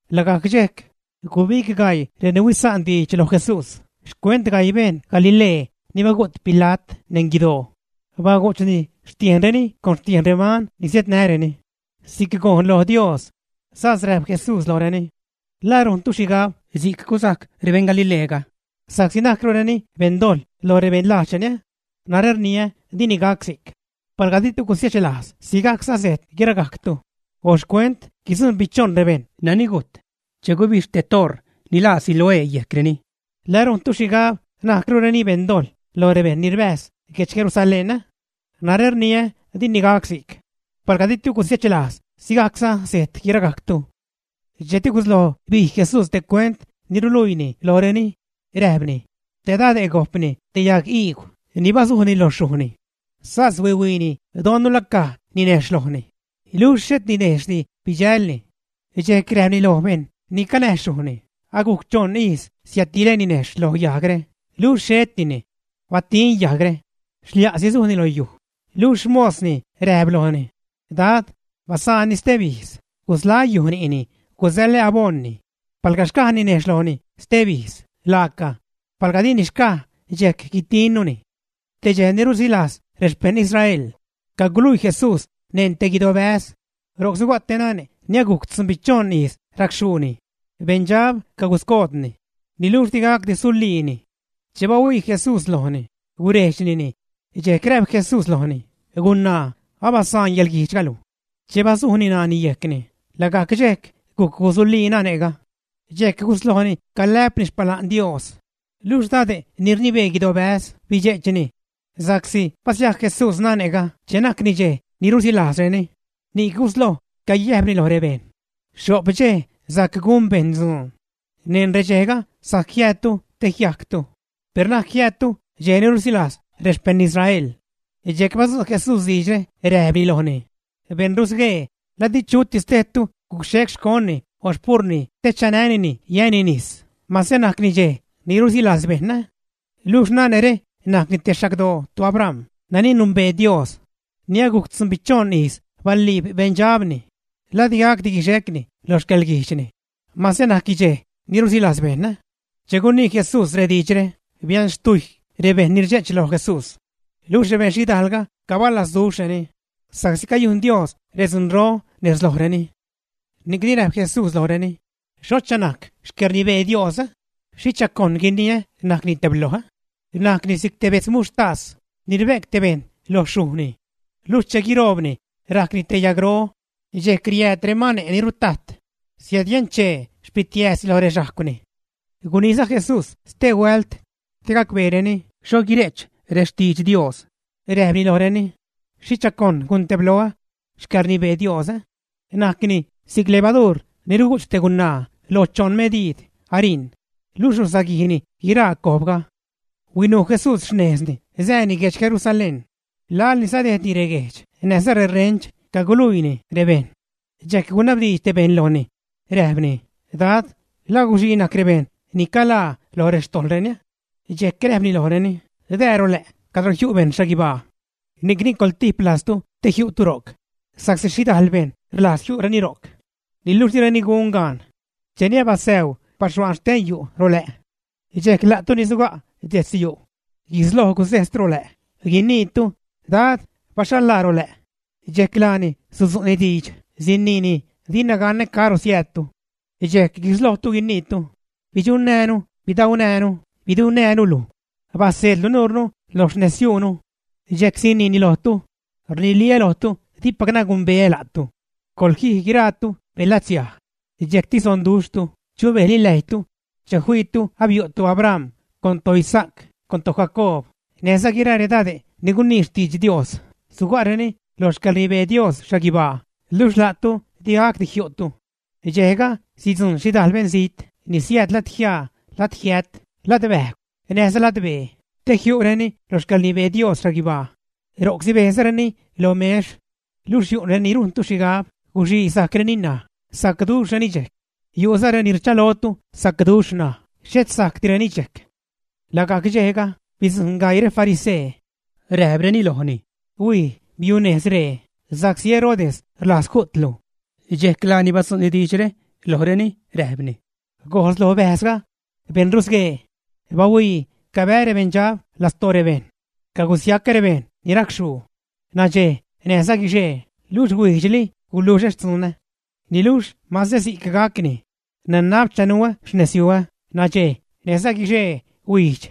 Lagajc dxejc, gubig gaii reni huisa'nreni diidx loj Jesús xcuent gaii beṉ Galilee ni bagu't Pila't neṉ guidoo, bagu'chni xtiejnreni con xtiejn reman ni siädnäreni si'c gojn lo Dios. Sas räjp Jesús lojreni: ―¿La rujntu xhigab si'c gusajc rebeṉ Galileega sa'csi najcrureni beṉdojḻ lo rebejṉ lajdxreni? Narä rniä, dini gac si'c. Palga di'tu gusiechlajz sigajcza sejt guiragajctu. O xcuent guitzunbichoṉ rebejṉ nani gujt che gubixh te oṟ ni laa Siloé yejcreni, ¿La rujntu xhigab najcrureni beṉ dojḻ lo rebejṉ ni rbäjz guedx Jerusalén, ä? Narä rniä, dini gac si'c. Palga di'tu gusiechlajz, sigajcza sejt guiragajctu. Dxejcti gusloj bij Jesús te cuent ni ruluiini lojreni, räjpni: ―Te dade' gojp te yagiigw ni basujni lo xyujni. Sas huihuiini don la caj ninejxh lojni. Luxh xhet ninejxhdi bidxälni. Dxejc räjpni loj bejṉ ni canäj xyujni, agujc choṉ ijz siädtilä ninejxh lo yajgre, luxh xhetini. Batin yajgre. ¡Xlia'si sujni lo yuj! Luxh xmosni räjp lojni: “Dad, basaanni steb ijz, gusḻaä́ yuj ni'ni, gusäḻä aboṉni. Palga xcaj ninejxh lojni steb ijz, laaca, palga dini xcaj, dxejc guitinnuni.” Te dxej ni rusilajz rexpejṉ Israel caguluii Jesús neṉ te guidobäz. Ro'c suga' te nane' ni agujc tzunbichoṉ ijz racxhuuni. Beṉdxab caguscoodni, niluxh di gacdi suliini. Che bahuii Jesús lojni, gurejdxnini, dxejc räjp Jesús lojni: ―Gunaa, abasaan yäḻguijdxga luj. Che basujni ṉaani yejcni, lagajc dxejc gujc gusulii nane'ga. Dxejc guslojni calä'pni xpala'n Dios. Luxh dade' ni rnibee guidobäz bidxe'chni sa'csi basiajc Jesús nane'ga che najcni dxej ni rusilajzreni, ni'c gusloj cayäjpni loj rebejṉ: ―Xho'p dxej sajc gun bejṉ dzuun; neṉ redxejga sajc jiäädtu te jiajctu, per na'c jiäädtu dxej ni rusilajz rexpejṉ Israel. Dxejc badzu' Jesús diidxre, räjpni lojni: ―¡Beṉ rusguee! ¿La di chutis tejtu guxhec xconni o xpurni te chanänini yäni nis, mase najcni dxej ni rusilajz bejṉ, ä? Luxh nane're najc te xagdoo toAbram, nani numbee Dios, ni agujc tzunbichoṉ ijz baliib beṉdxabni, ¿la digacdi guixecni lo xcäḻguijdxni mase najcni dxej ni rusilajz bejṉ, ä? Che gunii Jesús rediidxre, bianxtujy rebejṉ ni rdxe'ch loj Jesús, luxh rebeṉ xhidaalga cabalazduxhreni sa'csi cayujn Dios redzunro nez lojreni. Ni'cni räjp Jesús lojreni: ―¿Xhocha najc xcäḻrnibee Dios? ¿Xhicha cojn guiniä najcni tebloj? Najcni si'c te bedz muxhtas ni rbe'c te bejṉ lo xyujni. Luxh che guiroobni, rajcni te yagro. Dxejc riääd remane' ni rutajt siädyunchee xpitiääzni loj rexhajcwni. Guniiza Jesús stehuält te gacbeereni xho guire'ch rextidx Dios. Räjpni lojreni: ―¿Xhicha cojn guntebloä xcäḻrnibee Dios? Najcni si'c levaduur ni rugu'ch te gunaa lo choṉ mediid ariṉ, luxh rusaguijni guiraa cojbga. Huinuu Jesús xnejzni sääni guedx Jerusalén. Laḻni sadejdni reguejdx näjza rerench caguluiini rebejṉ. Dxejc gunabdiidx te bejṉ lojni, räjpni: ―Dad, ¿la guxii najc rebejṉ ni caḻaa loj rextojḻreni, ä? Dxejc räjpni lojreni: ―Dää rolä' cadro jiu' bejṉ xhaguibaa. Ni'cni coḻtip lajztu te jiu'tu ro'c, sa'csi xhidajl bejṉ rlajz jiu'reni ro'c, niluxh direni gun gaan. Cheni abasäu baxhuaan xten yu' rolä', dxejc la'tu ni suga' detz yu' guisloj gusejstu rolä', guiniitu: “Dad, baxhal-laa rolä'”, dxejc laani sudzu'ni diidx, siniini: “Dina ganä caro siäädtu.” Dxejc guislojtu guiniitu: “Bidxunnäänu, bidaunäänu, bidunnäänu luj, baseedlu nuurnu lo xnezyuunu.” Dxejc siniini lojtu: “Rniliä́ lojtu, dipacnä gumbeä la'tu. Coḻjij guiraatu, beṉlatsiaj.” Dxejcti sonduxhtu, chubejli läjytu che fiitu abiu' toAbram, con toIsaac, con toJacoob, näjza guiraa redade' ni gunii xtidx Dios, suga'reni lo xcäḻrnibee Dios xhaguibaa, luxh la'tu di gacdi jiu'tu. Dxejga sidzujṉ xhidajl beṉzijt ni siääd ladjiaa, ladjiät, ladbäjgw, näjza ladbee, te jiu'reni lo xcäḻrnibee Dios xhaguibaa, ro'c sibejzareni lo mex. Luxh yu' reni rujntu xhigab guxii sajcreni ṉaj, sacduxhreni dxejc. Yu'za reni rchalotu sacduxh ṉaj, xhet sajcdireni dxejc. Lagajc dxejga, bidzujṉ gaii refarisee, räjpreni lojni: ―Huij, biunejz ree, sa'csi Herodes rlajz ju'tlu. Dxejc laani badzu'ni diidxre lojreni, räjpni: ―Gojz lo bäjzga, beṉ rusguee: “¡Bahuii! cabää́ rebeṉdxab lastoo rebejṉ, cagusiacä rebejṉ ni racxhuu nadxej näjza guixee, luxh huijdxli guluxä xtzunä.” Niluxh mase si'c gacni nanab chanuä xnezyuä nadxej näjza guixee, huijdx,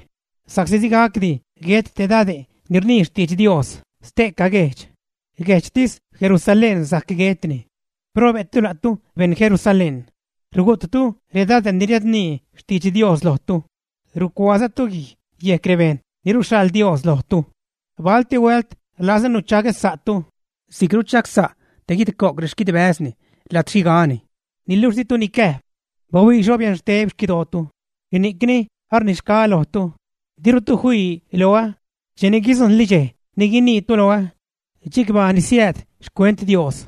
sa'csi di gacdi guet te dade' ni rnii xtidx Dios ste'ca guejdx, guejdxtis Jerusalén sajc guetni. ’¡Probe'tu, la'tu beṉ Jerusalén! Rugu'ttu redade' ni riädnii xtidx Dios lojtu, rucuaazatu guij yejc rebejṉ ni ruxhaḻ Dios lojtu. Balti huält rlazä nuchagä sa'tu si'c ruchagsa' te guidco'c rexquidbäzni lajd xhigani, niluxh ditu nicäjp. Bahuii xho bianxteb xquidootu. Ni'cni arnixgaä lojtu, dirutu fii loä cheni guidzujṉli dxej ni guiniitu loä: “Chicbaa ni siääd xcuent Dios.”